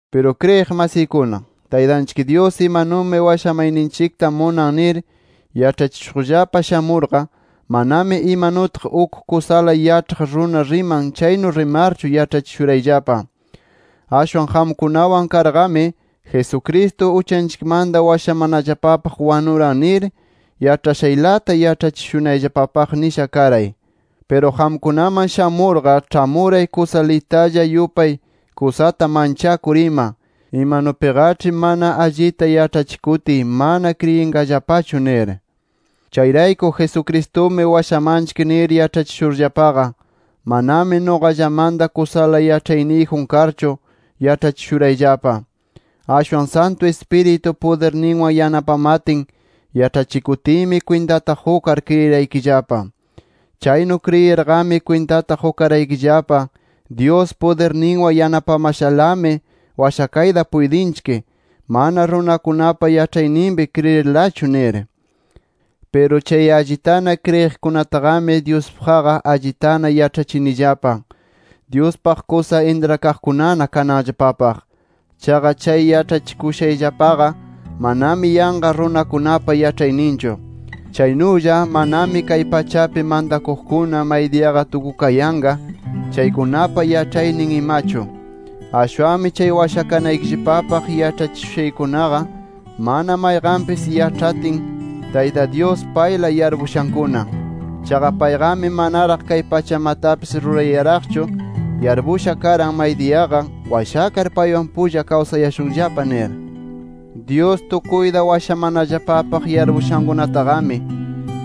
Piru kriyiq masiykuna, Taytanchik Dyus imanumi washamayninchikta munan nir yaĉhachishuqllapa shamurqa, manami imanutaq uk kusala yaĉhaq runa riman chaynu rimarchu yaĉhachishurayllapa. Ashwan qamkunawan karqami Jesucristo uchanchikmanta washamanallapapaq wanuran nir yaĉhashaylata yaĉhachishunayllapapaq nisha karay. Piru qamkunaman shamurqa ĉhamuray kusa litalla yupay kusata manchakur ima, imanupiqaĉhi mana allita yaĉhachikutiy mana kriyinqallapachu nir. Chayrayku Jesucristumi washamanchik nir yaĉhachishurllapaqa, manami nuqallamanta kusala yaĉhayniyjun karchu yaĉhachishurayllapa. Ashwan Santu Ispiritu pudirninwan yanapamatin yaĉhachikutiymi, kwintata qukar kriyiraykillapa. Chaynu kriyirqami kwintata qukaraykillapa Dyus pudirninwan yanapamashalami washakayta puytinchik, mana runakunapa yaĉhayninpi kriyirlachu nir. Piru chay allitana kriyiqkunataqami, Dyuspaqqa allitana yaĉhachinillapa, Dyuspaq kusa intrakaqkunana kananllapapaq. Chaqa chay yaĉhachikushayllapaqa, manami yanqa runakunapa yaĉhayninchu. Chaynulla manami kay pachapi mantakuqkuna maydiyaqa tukukayanqa chaykunapa yaĉhaynin imachu. Ashwanmi chay washakanaykillapapaq yaĉhachikushaykunaqa, mana mayqanpis yaĉhatin, Tayta Dyus payla yarpushankuna. Chaqa payqami manaraq kay pachamatapis rurayaraqchu yarpushana karan, maydiyaqa washakar paywan pulla kayashunllapa nir. Dyus tukuyta washamanallapapaq yarpushankunataqami,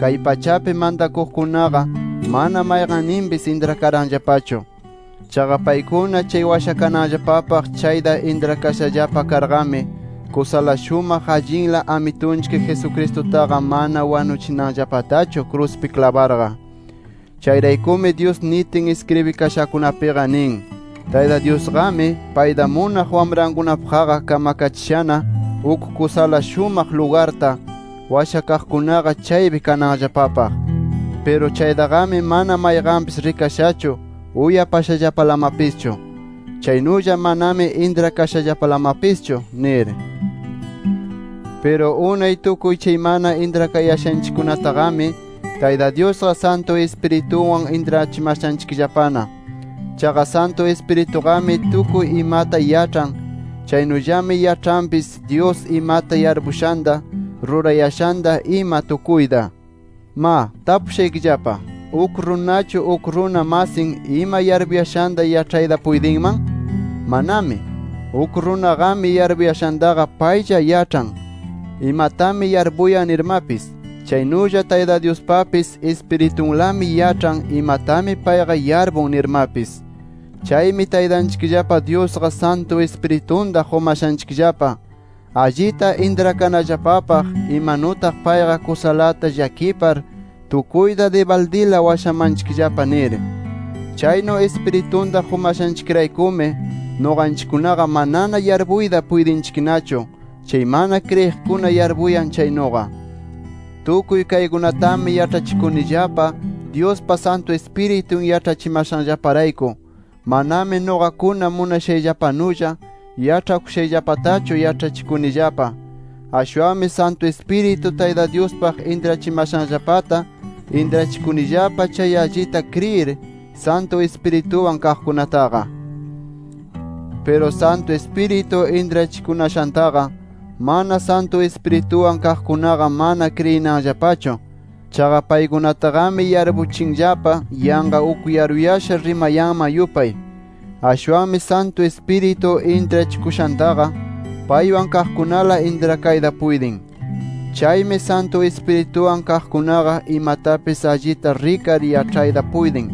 kay pachapi mantakuqkunaqa mana mayqanninpis intrakaranllapachu. Chaqa paykuna chay washakananllapapaq chayta intrakashallapa karqami, kusala shumaq allinla Amitunchik Jesucristutaqa mana wanuchinanllapatachu kruspi klabarqa. Chayraykumi Dyus nitin iskribikashakunapiqa nin: “Tayta Dyusqami, payta munaq wamrankunapaqqa, kamkachishana uk kusala shumaq lugarta, washakaqkunaqa chaypi kananllapapaq. Piru chaytaqami mana mayqanpis rikashachu, uyapashallapalamapischu. Chaynulla manami intrakashallapalamapischu” nir. Piru unay tukuy chay mana intrakayashanchikkunataqami, Tayta Dyusqa, Santu Ispiritunwan intrachimashanchikllapana. Chaqa Santu Ispirituqami tukuy imata yaĉhan, chaynullami yaĉhanpis Dyus imata yarpuyashanta, ruranayashanta ima tukuyta. ¡Ma, tapushaykillapa! ¿Uk runachu, uk runa masin ima yarpuyashanta yaĉhayta puytinman? ¡Manami! Uk runaqami yarpuyashantaqa paylla yaĉhan imatami yarpuyan nirmapis. Chaynulla Tayta Dyuspapis Ispiritunlami yaĉhan imatami payqa yarpun nirmapis. Chaymi Taytanchikllapa Dyusqa, Santu Ispiritunta qumashanchikllapa, allita intrakanallapapaq imanutaq payqa kusalata llakipar tukuyta dibaldila washamanchikllapa nir. Chaynu Ispiritunta qumashanchikraykumi, nuqanchikkunaqa manana yarpuyta puytinchiknachu chay mana kriyiqkuna yarpuyan chaynuqa. Tukuy kaykunatami yaĉhachikunillapa, Dyuspa Santu Ispiritun yaĉhachimashanllaparayku. Manami nuqakuna munashayllapanulla yaĉhakushayllapatachu yaĉhachikunillapa. Ashwanmi Santu Ispiritu, Tayta Dyuspaq intrachimashanllapata, intrachikunillapa chay allita kriyir, Santu Ispirituwan kaqkunataqa. Piru Santu Ispiritu intrachikunashantaqa, mana Santu Ispirituwan kaqkunaqa mana kriyinanllapachu. Chaqa paykunataqami yarpuchinllapa yanqa uk yaruyasha rimayanman yupay. Ashwanmi Santu Ispiritu intrachikushantaqa, paywan kaqkunala intrakayta puytin. Chaymi Santu Ispirituwan kaqkunaqa, imatapis allita rikar yaĉhayta puytin.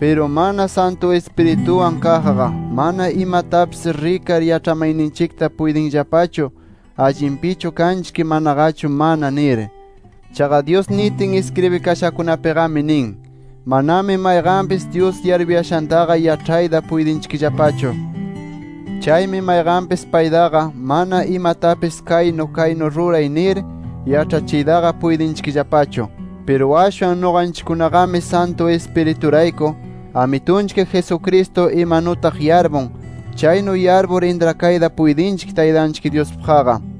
Piru mana Santu Ispirituwan kaqqa mana imatapis rikar yaĉhamayninchikta puytinllapachu, allinpichu kanchik manaqachu mana nir. Chaqa Dyus nitin iskribikashakunapiqami nin: “Manami mayqanpis, Dyus yarpuyashantaqa yaĉhayta puytinchikllapachu. Chaymi mayqanpis paytaqa mana imatapis kaynu kaynu ruray nir yaĉhachiytaqa puytinchikllapachu” Piru ashwan nuqanchikkunaqami Santu Ispiriturayku, Amitunchik Jesucristo imanutaq yarpun, chaynu yarpur intrakayta puytinchik Taytanchik Dyuspaqqa.